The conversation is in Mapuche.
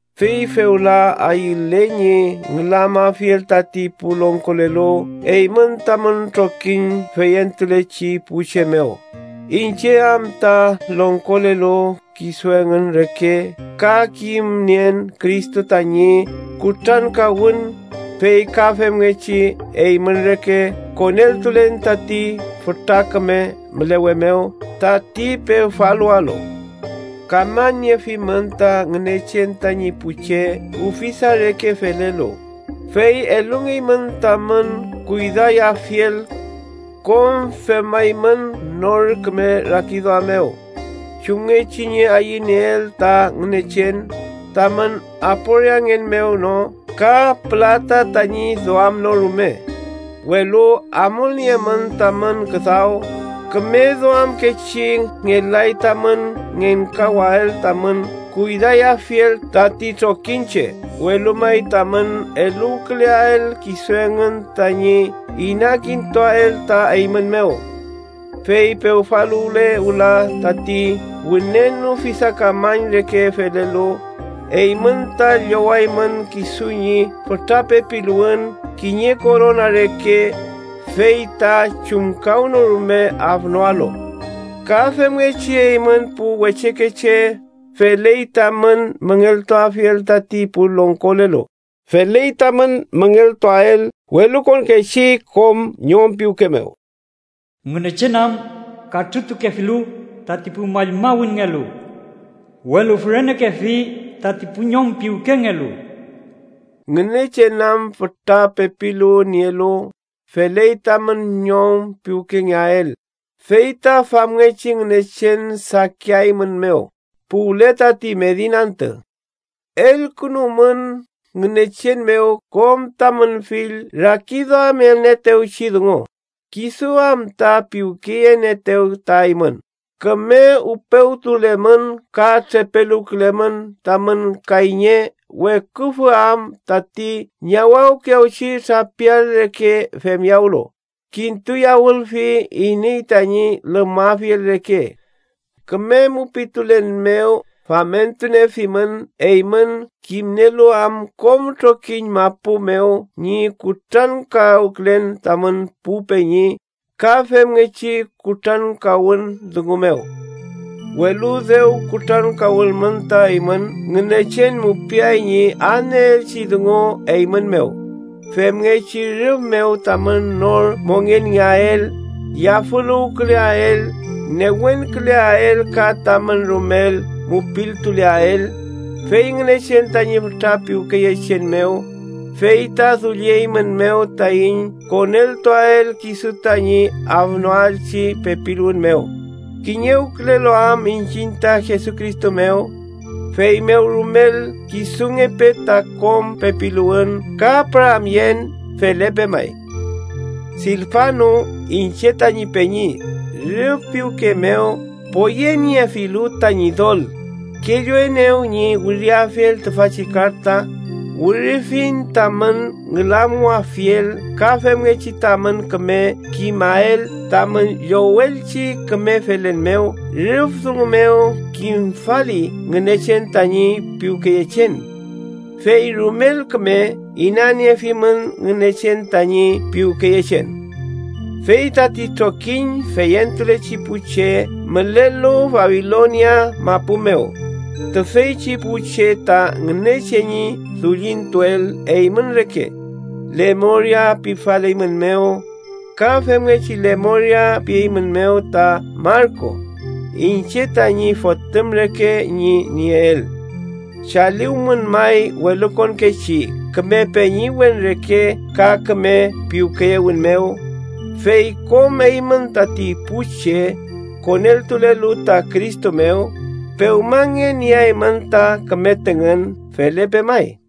Fey fewla ayülen ñi ngülamafiel tati pu longkolelu eymün tamün trokiñ feyentulechi pu che mew, iñche am ta longkolelu kisu engün reke ka kimnien Cristo tañi kutrankawün, fey ka femngechi eymün reke, koneltulen tati fütra küme mülewe mew tati pewfaluwalu. Kamañniefimün ta Ngünechen tañi pu che ufisa reke felelu, fey elungeymün tamün kuydayafiel. Kom femaymün nor küme rakiduam mew, chumngechi ñi ayünieel ta Ngünechen, tamün aporiangen mew no ka pülata tañi duam no rume, welu amulniemün tamün küdaw küme duamkechi. Ngelay tamün ngenkawael tamün kuydayafiel tati trokiñche, welu may tamün eluwküleael kisu engün tañi inakintuael ta eymün mew. Fey pewfaluwle wüla tati wünen ufisakamañ reke felelu, eymün ta llowaymün kisu ñi fütra pepiluwün kiñe korona reke, fey ta chumkawnorume afnoalu. Ka femngechi, eymün pu wechekeche, feley tamün müngeltuafiel tati pu longkolelu. Feley tamün müngeltuwael welukonkechi kom ñom piwke mew: “Ngünechen am, katrütukefilu tati pu mallmawünngelu, welu fürenekefi tati pu ñom piwkengelu.” Ngünechen am fütra pepiluwün nielu, feley tamün ñom piwkengeael, fey ta famngechi Ngünechen sakiaeymünmew puwle tati medin antü. Elkünumün Ngünechen mew kom tamün fill rakiduamelnieetewchi dungu, kisu am ta piwkeyenieetew ta eymün. Küme upewtulemün ka trepeluwkülemün, tamün kayñe weküfü am tati ñawawkiyawchi trapial reke femyawlu, kintuyawülfi iney tañi lümüafiel reke. Küme mupiltulen mew famentuniefimün, eymün kimnielu am kom trokiñ mapu mew ñi kutrankawkülen tamün pu peñi ka femngechi kutrankawün dungu mew. Welu dew kutrankawülmün ta eymün, Ngünechen mupiay ñi adnieelchi dungu eymün mew, femngechi rüf mew tamün nor mongenngeael, yafüluwküleael, newenküleael ka tamün rumel mupiltuleael. Fey Ngünechen tañi fütra piwkeyechen mew, fey ta dullieiñmew taiñ koneltuael kisu tañi afnoachi pepiluwün mew, kiñewkülelu am iñchiñ ta Jesucristo mew. Feymew rumel kisungepe ta kom pepiluwün ka püramyen. Felepe may. Silfanu, iñche tañi peñi, rüf piwke mew poyeniefilu ta Ñidol, kelluenew ñi wiriafiel tüfachi karta. Wirifiñ tamün ngülamuwafiel ka femngechi tamün küme kimael tamün llowelchi küme felen mew rüf dungu mew kimfali Ngünechen tañi piwkeyechen. ¡Fey rumel küme inaniefimün Ngünechen tañi piwkeyechen! Fey tati trokiñ feyentulechi pu che mülelu Babilonia mapu mew, tüfeychi pu che ta Ngünechen ñi dullintuel eymün reke, lemoria pifaleymünmew. Ka femngechi lemoria pieymünmew ta Marku, iñche tañi fotüm reke ñi nieel. Chaliwmün may welukonkechi küme peñiwen reke ka küme piwkeyewün mew. Fey kom eymün, tati pu che koneltulelu ta Cristo mew, pewmangen nieaymün ta küme tüngün. Felepe may.